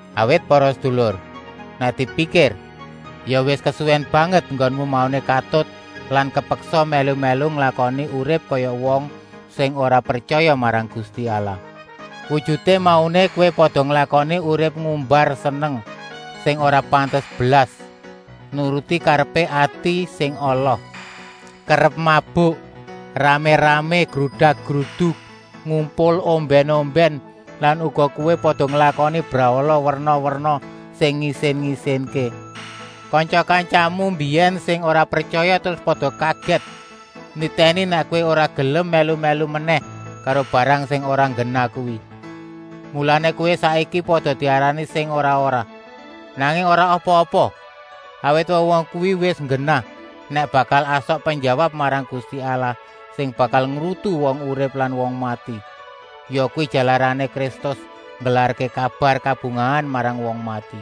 Awit para sedulur, nèk dipikir ya wis kesuwèn banget enggonmu mauné katut lan kepeksa mèlu-mèlu nglakoni urip kaya wong sing ora pretyaya marang Gusti Allah. Wujuté mauné kowé pada nglakoni urip ngumbar seneng sing ora pantes blas, nuruti karepé ati sing ala, kerep mabuk, ramé-ramé grudak-gruduk, ngumpul ombèn-ombèn lan uga kowé pada nglakoni brahala werna-werna sing ngisin-isinké. Kantya-kantyamu mbiyèn sing ora pretyaya terus pada kagèt nitèni nèk kowé ora gelem mèlu-mèlu menèh karo barang sing ora nggenah kuwi. Mulané kowé saiki pada diarani sing ora-ora. Nanging ora apa-apa, awit wong-wong kuwi wis nggenah nèk bakal asok penjawab marang Gusti Allah sing bakal ngrutu wong urip lan wong mati. Yakuwi jalarané Kristus nggelarké kabar kabungahan marang wong mati.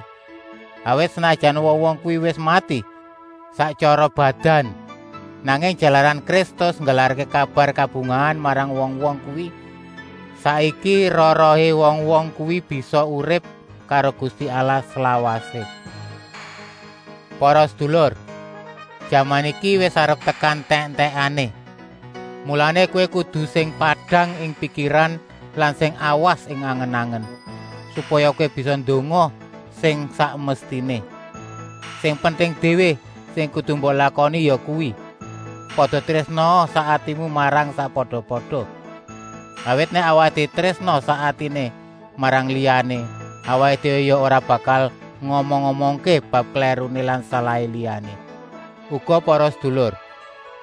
Awit, senajan wong-wong kuwi wis mati sak tyara badan, nanging jalaran Kristus nggelarké kabar kabungahan marang wong-wong kuwi, saiki roh-rohé wong-wong kuwi bisa urip karo Gusti Allah slawasé. Para sedulur, jaman iki wis arep tekan entèk-entèkané. Mulané kowé kudu sing padang ing pikiran lan sing awas ing angen-angen, supaya kowé bisa ndonga sing sak mestiné. Sing penting déwé sing kudu mbok lakoni yakuwi, pada trésnaa sak atimu marang sakpada-pada. Awit nèk awaké trésna sak atiné marang liyané, awaké déwé ya ora bakal ngomong-omongké bab klèruné lan salahé liyané. Uga para sedulur,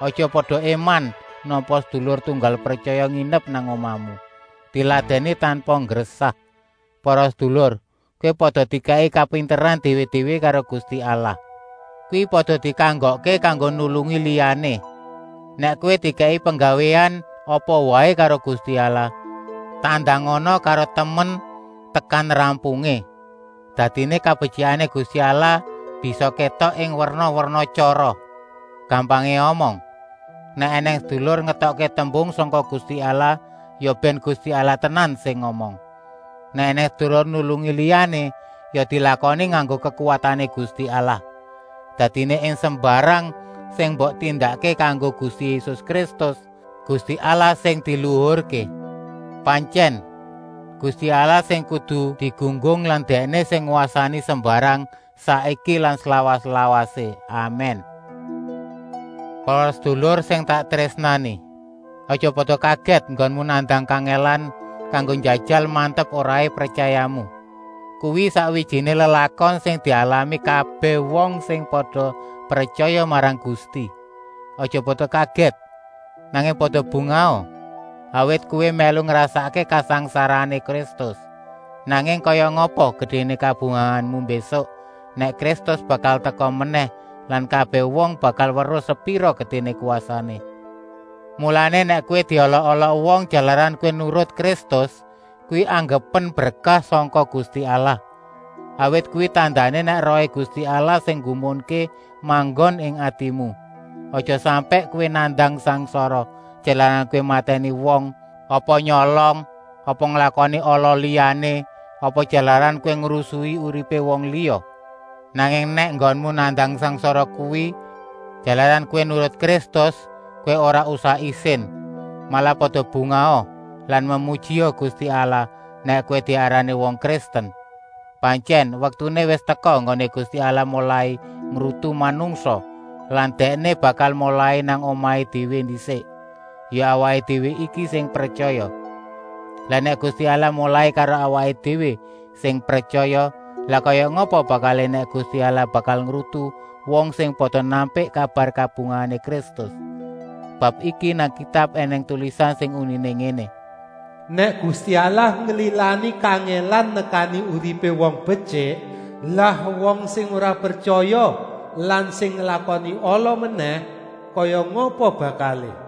aja pada éman nampa sedulur tunggal pretyaya nginep nang omahmu. Diladèni tanpa nggresah. Para sedulur, kowé pada dikèki kapinteran déwé-déwé karo Gusti Allah, kuwi pada dikanggokké kanggo nulungi liyané. Nèk kowé dikèki penggawéan apa waé karo Gusti Allah, tandangana karo temen tekan rampungé. Dadiné kabetyikané Gusti Allah bisa kétok ing werna-werna tyara. Gampangé omong: Nèk ènèng sedulur ngetokké tembung sangka Gusti Allah, ya bèn Gusti Allah tenan sing ngomong. Nèk ènèng sedulur nulungi liyané, ya dilakoni nganggo kekuwatané Gusti Allah. Dadiné ing sembarang sing mbok tindakké kanggo Gusti Yésus Kristus, Gusti Allah sing diluhurké. Pantyèn, Gusti Allah sing kudu digunggung lan Dèkné sing ngwasani sembarang, saiki lan slawas-lawasé. Amèn! Para sedulur sing tak trésnani, aja pada kagèt enggonmu nandang kangèlan kanggo njajal mantep-oraé pretyayamu. Kuwi sakwijiné lelakon sing dialami kabèh wong sing pada pretyaya marang Gusti. Aja pada kagèt, nanging pada bungaha, awit kowé mèlu ngrasakké kangsangsarané Kristus. Nanging kaya ngapa gedéné kabungahanmu mbésuk nèk Kristus bakal teka menèh lan kabèh wong bakal weruh sepira gedéné kwasané. Mulané, nèk kowé diolok-olok wong jalaran kowé nurut Kristus, kuwi anggepen berkah sangka Gusti Allah, awit kuwi tandané nèk Rohé Gusti Allah sing nggumunké manggon ing atimu. Aja sampèk kowé nandang sangsara, jalaran kowé matèni wong apa nyolong apa nglakoni ala liyané apa jalaran kowé ngrusui uripé wong liya. Nanging nèk enggonmu nandang sangsara kuwi jalaran kowé nurut Kristus, kowé ora usah isin. Malah pada bungaha lan memujia Gusti Allah nèk kowé diarani wong Kristen. Pantyèn, waktuné wis teka enggoné Gusti Allah molai ngrutu manungsa lan Dèkné bakal molai nang omahé déwé ndisik, ya awaké déwé iki sing pretyaya. Lah nèk Gusti Allah molai karo awaké déwé sing pretyaya, lah kaya ngapa bakalé nèk Gusti Allah bakal ngrutu wong sing pada nampik kabar kabungahané Kristus. Bab iki nang Kitab ènèng tulisan sing uniné ngéné: “Nèk Gusti Allah nglilani kangèlan nekani uripé wong betyik, lah wong sing ora pretyaya lan sing nglakoni ala menèh, kaya ngapa bakalé?”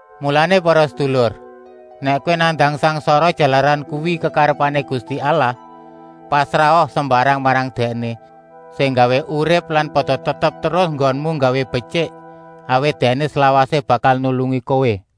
Mulané para sedulur, nèk kowé nandang sangsara jalaran kuwi kekarepané Gusti Allah, pasraha sembarang marang Dèkné sing nggawé urip lan pada tetep terus enggonmu nggawé betyik, awit Dèkné slawasé bakal nulungi kowé.